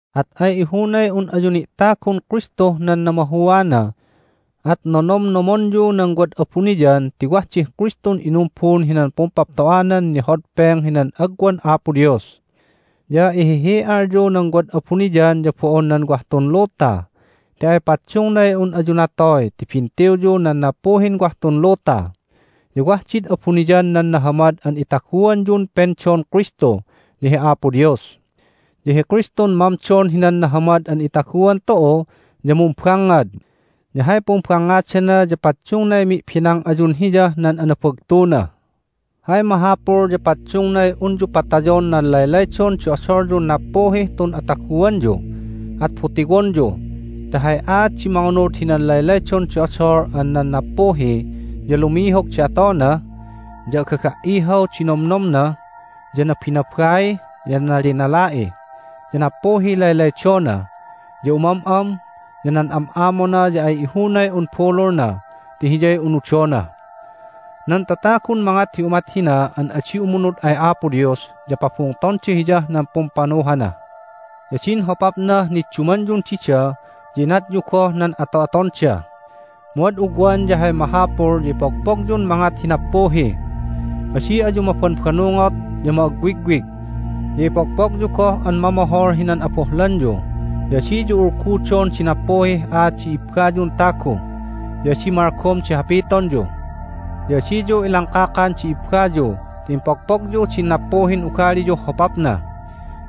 At ay ihunay un ayu ni'tagun Kristuh nan namahuana. At nonomnomonyu nan wad abuniyan ti wah dih Kristun inumbun hinan pumpapto'anan nihodpeng hinan agwan Apo Dios. Ya ihihi'alyu nan wad abuniyan ya bo'on nan wah tun luta ti ay paddungnay un ayu natoy ti bintiwyu nan nappuhin wah tun luta. Ya wah did abuniyan nan nahamad an itaguanyun pendon Kristu ya hi Apo Dios. Ya hi Kristun mamdon hinan nahamad an itaguan tu'u, ya mumbangngad, ya hay pumbangngadana ya paddungnay mi'benang ayun Hiyah nan anabagtuna! Hay mahapul ya paddungnay unyu patayon nan laylaydon di odolyun nappuhih tun ataguanyu, at butiwonyu. Ti hay aat di mangunud hinan laylaydon di odol an nan nappuhi ya lumihog di atona, ya agaga"ihaw di nomnomna, ya nabinabai, ya nalinala'i, ya nappuhiy laylaydona, ya umam'am, ya nan am'amona ya ay ihunay un bululna ti hiyay unudona. Nan tatagun mangat hi umat hina an adi umunud ay Apo Dios ya pabungtonda Hiyah nan pumpanuhana. Ya din hopapnah niddumanyun dida ya inatyu goh nan ato'atonda. Mu ad ugwan ya hay mahapul ya ipogpogyun mangat hi nappuhi. Adi ayu mabanbannungot ya ma'agwigwig. Ya ipogpogyu goh an mamohol hinan abohlanyu, ya adiyu ulgudon di nappuhih aat di ibbayun tagu, ya adi malgom di hapitonyu. Ya adiyu ilangkakan di ibbayu ti impogpogyu din nappuhin ugaliyuh hopapna.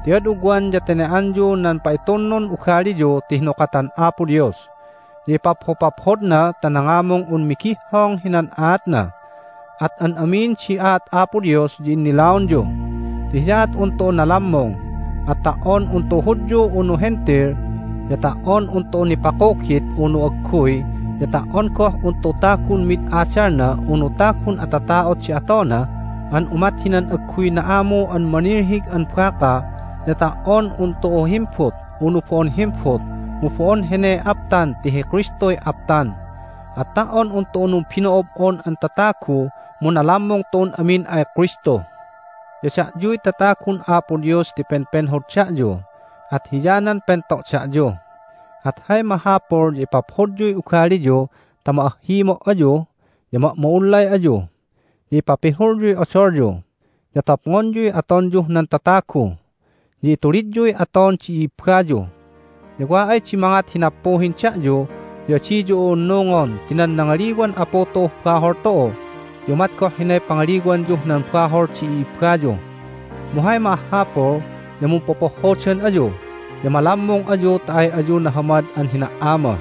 Ti ad ugwan ya tene"anyu nan pa'itunnun ugaliyu ti hinukatan Apo Dios, ya ipaphopaphodna ta nangamung un migihhong hinan aatna, at an amin di aat Apo Dios ya innilaonyu. Ti hiyaat un tu'u nalammung, at ta"on un tu'u Hudyu unu Hentil, ya ta"on un tu'u nipakugit unu agguy, ya ta"on goh un tu'u tagun mid adalna unu tagun atata'ot di atona an umat hinan agguy na'amu an manilhig an baka, ya ta"on un tu'u himbut unu bo'on himbut, mu bo'on heney aptan ti hi Kristuy aptan. At ta"on un tu'u numbino'ob'on an tatagu mu nalammung tu'un amin ay Kristu! Ya da'yuy tatagun Apo Dios ti penpenhod da'yu, at hiyanan pento' da'yu. At hay mahapul ya ipaphodyuy ugaliyu ta ma'ahhimo' ayu, ya ma'ma'ullay ayu. Ya ipapihulyuy odolyu, ya topngonyuy atonyuh nan tatagu. Ya itulidyuy aton di i'ibbayu, ya wa ay di mangat hi nappuhin da'yu ya adiyu u'unnungon ti nan nangaliwan Apu tu'uh bahol tu'u ya umat goh hinay pangaliwanyuh nan bahol di i'ibbayu. Mu hay ma'ahhapul ya mumpopohhodan ayu, ya malammung ayu ta ay ayu nahamad an hina"ama.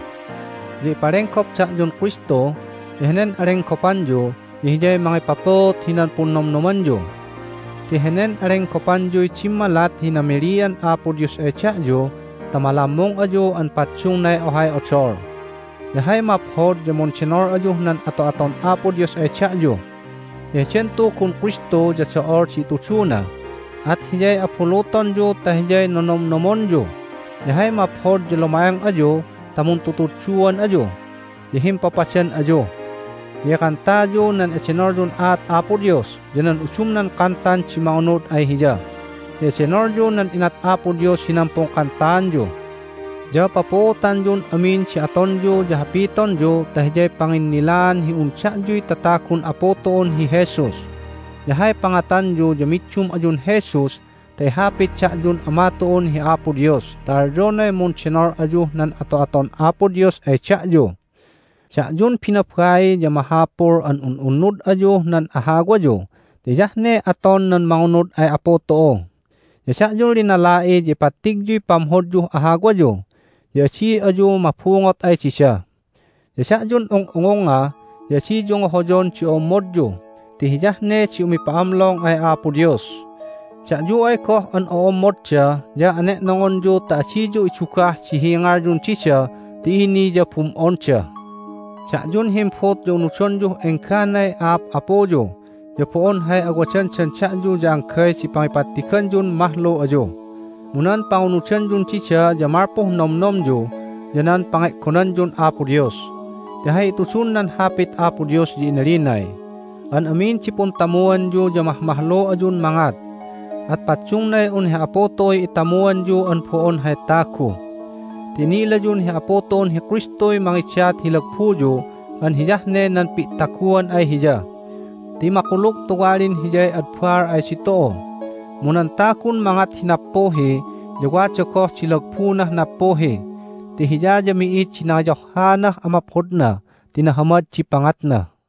Ya ipalenggop da'yun Kristu, ya henen alenggopanyu ya hiyay mangipapuut hinan punnomnomanyu. Ti henen alenggopanyuy dimmalat hi namilian Apo Dios ay da'yu ta malammung ayu an paddungnay ohay odol. Ya hay maphod ya mundenol ayuh nan ato'aton Apo Dios ay da'yu. Ya heden Tugun Kristu ya do'ol di ituduna, at hiyay abulutonyu ta hiyay nonomnomonyu. Ya hay maphod ya luma'eng ayu ta muntutudduan ayu, ya himpapadan ayu. Ya ikantayu nan edenolyun aat Apo Dios ya nan udumnan kantan di mangunud ay Hiya, ya edenolyu nan inat Apo Dios hinan pungkantaanyu. Ya papuutanyun amin di atonyu ya hapitonyu ta hiyay panginnilaan hi un da'yuy tatagun Apu tu'un hi Jesus. Ya hay pangatanyu ya middum ayun Jesus ta ihapit da'yun Ama tu'un hi Apo Dios ta alyonay mundenol ayuh nan ato'aton Apo Dios ay da'yu. Da'yun binabai ya mahapul an un'unnud ayuh nan ahawayu ti hiyah ne aton nan mangunud ay Apu tu'u. Ya da'yun linala'i ya ipattigyuy pamhodyuh ahawayu, ya adi ayu mabungot ay dida. Ya da'yun ung'ungungnga ya adiyu ngohoyon di o'ommodyu ti hiyah ne di umipa'amlong ay Apo Dios. Da'yu ay goh an o'ommodda ya ane'nongonyu ta adiyu idugah di hingalyun dida ti ini ya bum'onda. Da'yun himbut ya unudonyuh engganay a'ap'apuyu, ya bo'on hay awadandan da'yu ya anggay di pangipattiganyun mahlu ayu, mu nan pangunudanyun dida ya malpuh nomnomyu ya nan pange'gonanyun Apo Dios. Ti hay itudun nan Hapit Apo Dios ya inalinay, "An amin di puntamuanyu ya mahmahlu ayun mangat." At paddungnay un hi Apu tu'uy itamuanyu an bo'on hay tagu. Ti inilayun hi Apu tu'un hi Kristuy mangidat hi lagbuyu an hiyah ne nan pi'taguan ay Hiya. Ti makulug tuwalin Hiyay ad baal ay ditu'u. Mu nan tagun mangat hi nappuhi ya wada goh di lagbunah nappuhi, ti Hiya ya mi'id di nangiyohhaanah amaphodna ti nahamad di pangatna.